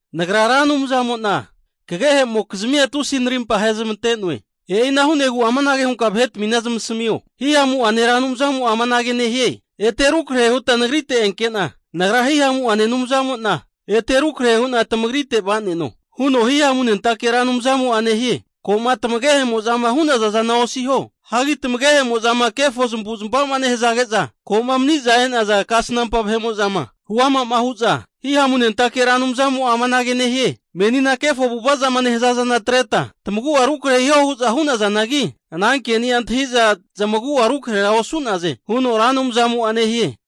Nagra Ra Anumzamo'na kagehemokizmia tusi'a narimpa ahezmante'noe. E'ina hu'negu amanage hunka vahetmina zamasamio, Hihamu'ane Ra Anumzamo'a amanage nehie, Ete rukrahe huta Nagrite enkena, Nagra Hihamuane Anumzamo'na ete rukrahe hu'na tamagritera va'neno, huno Hihamunentake Ra Anumzamo'a nehie. Ko'ma tamagehe'mozama hu'naza zana osiho. Hagi tamagehemo'zama kefo zamavu'zmavazama nehazage'za ko'ma mani'za e'naza kasnampa vahe'mo'zama huama hu'za, Hihamunentake Ra Anumzamo'a amanage nehie, menina kefo avu'ava zama nehaza zana atreta tamagu'a rukrahe hiho hu'za hunazanagi, ana keni'a antahi'za zamagu'a rukrahera osu'naze, huno Ra Anumzamo'a nehie.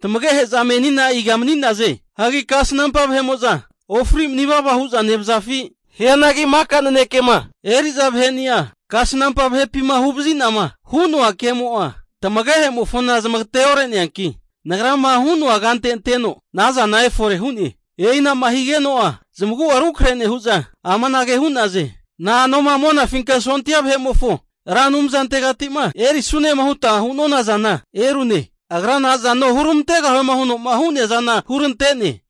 Tamagehe'za menina iga mani'naze? Hagi kasnampa vahe'mo'za ofri mani vava hu'za nevazafi? Hianagi maka nanekema eri'za vaheni'a kasnampa vahepima huvazi'nama hu'noa kemo'a, tamagehe'mofona zamagate ore'neanki, Nagrama hu'noa kante anteno ana zana efore hu'ne. E'inama higeno'a zamagu'a rukrahe nehu'za amanage hu'naze. Na'anoma Monafinka Sondia vahe'mofo Ra Anumzantegati'ma erisunema huta hu'nona zana erune. Agra nazano huramantegahuema huno'ma hu'nea zana hurante'ne.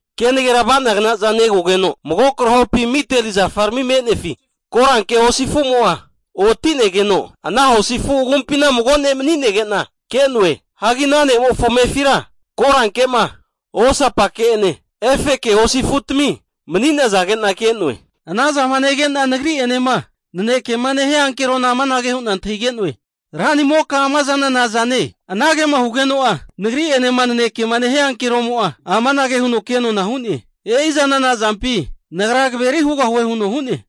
Kenagera ava'nagnaza negogeno, mago krahopi miteli zafarami me'nefi koranke hosi afumo'a oti'negeno, ana hosi afu agumpina mago ne' mani'nege'na ke'noe. Hagi ana ne'mofo amefira koranke'ma, osapake'ene efeke hosi afutami mani'nazage'na ke'noe. Anazama nege'na nagri'enema nanekema nehia ankerona amanage hu'na antahige'noe, Ranimoka, ama zana nazane? Anagema hugeno'a nagri'enema nanekema nehia ankeromo'a amanage huno kenona hu'ne, E'i zana nazampi, nagra kaveri hugahue huno hu'ne.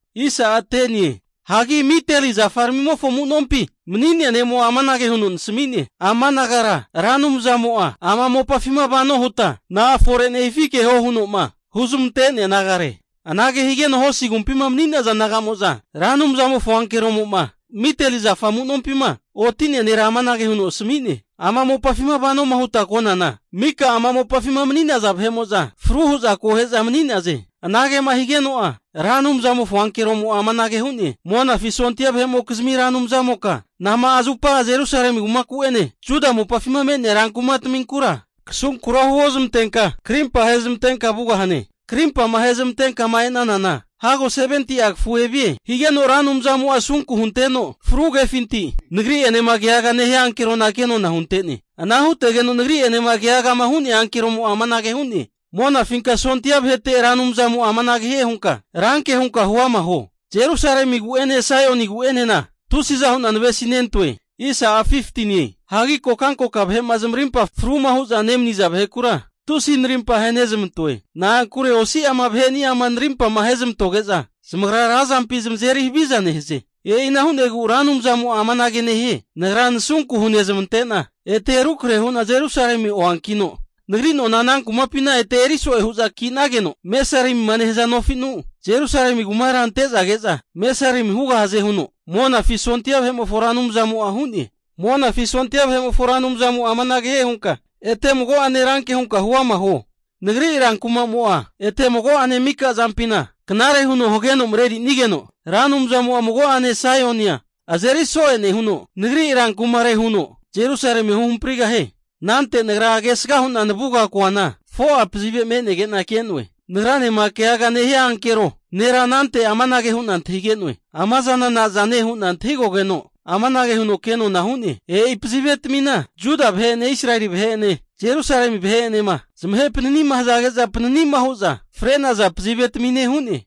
Hagi miteli zafaramimofo amu'nompi mani'nea ne'mo'a amanage huno nasmi'ne, Ama nagara Ra Anumzamo'a ama mopafima vano huta na'a fore nehifi keho huno'ma huzmante'nea nagare. Anage higeno hosi agumpima mani'naza naga'mo'za Ra Anumzamofo ankeroma miteli zafa amu'nompima oti'nea nera amanage hu'za asami'naze, Ama mopafima vanoma huta konana, mika ama mopafima mani'naza vahe'mo'za fru hu'za akohe'za mani'naze. Anagema higeno'a Ra Anumzamofo ankeromo'a amanage hu'ne, Monafi sondia vahe'mokizmi Ra Anumzamoka nama'a zupa Jerusalemi kumaku'ene Juda mopafima me'nea rankumataminkura kasunkura huozmante krimpa ahezmantenka vugahane? Karimpama ahezmantenkama e'nanana hago 70'a kafu evie. Higeno Ra Anumzamo'a asunku hunteno fru kefinti, nagri'enema keagama nehia ankerona kenona hunte'ne. Ana hutegeno nagri'enema keagama hu'nea ankeromo'a amanage hu'ne, Monafinka sondia vahe'mofo Ra Anumzamo'a amanage hie hunka ranke hunka huama huo. Jerusalemi kumaku'gu'ene Saioni kumaku'enena tusiza hu'na navesia nentoe. Hagi kokankoka vahe'ma zamarimpa fruma hu'za nemani'za vahekura, tusi narimpa ahenezmantoe. Na'ankure osi'ama vaheni'ama narimpama ahezmantoge'za, zamagra razampi zamazeri haviza nehaze. E'ina hu'negu Ra Anumzamo'a amanage nehie, Nagra nasunku hunezmante'na ete rukrahe hu'na Jerusalemi oankino, Nagri nona ana kumapina ete eri so'e hu'za ki'nageno, mesarimima nehaza nofinu Jerusalemi kumara ante'za ke'za mesarimia hugahaze, huno Monafi sondia vahe'mofo Ra Anumzamo'a hu'ne. Monafi sondia vahe'mofo Ra Anumzamo'a amanage hie hunka ete mago'ene ranke hunka huama huo, Nagri rankuma'mo'a ete mago'ane mika zampina knare huno hageno marerinigeno, Ra Anumzamo'a mago'ane Saionia azeri so'e nehuno, nagri rankumare huno Jerusalemia huhamprigahie. Anante nagra kesga hu'na navuga koana, 4'a pazive me'nege'na ke'noe. Nagranema keaga nehia ankero nera anante amanage hu'na antahige'noe. Ama zana nazane hu'na antahigogeno, amanage huno kenona hu'ne, E'i pazivetamina Juda vahe'ene, Israeli vahe'ene, Jerusalemi vahe'enema zamahe panani'ma hazage'za panani'ma hu'za fre'naza pazivetamine hu'ne.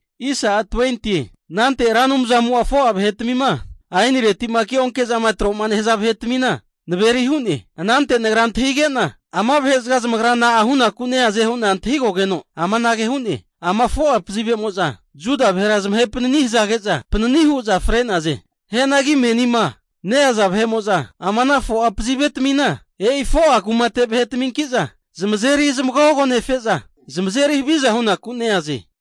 Anante Ra Anumzamo'a 4'a vahetmima ainireti'ma keonke zama troma nehaza vahetmina naveri hu'ne. Anante nagra antahige'na, ama vahe'zaga zamagra na'a hunaku neaze hu'na antahigogeno, amanage hu'ne. Ama 4'a pazivemo'za Juda vahera zamahe panani hazage'za panani hu'za fre'naze. Hianagi menima neaza vahe'mo'za ama ana 4'a pazivetamina, e'i 4'a kumate vahetaminki'za zamazeri zamagogonefe'za zamazeri haviza hunaku neaze.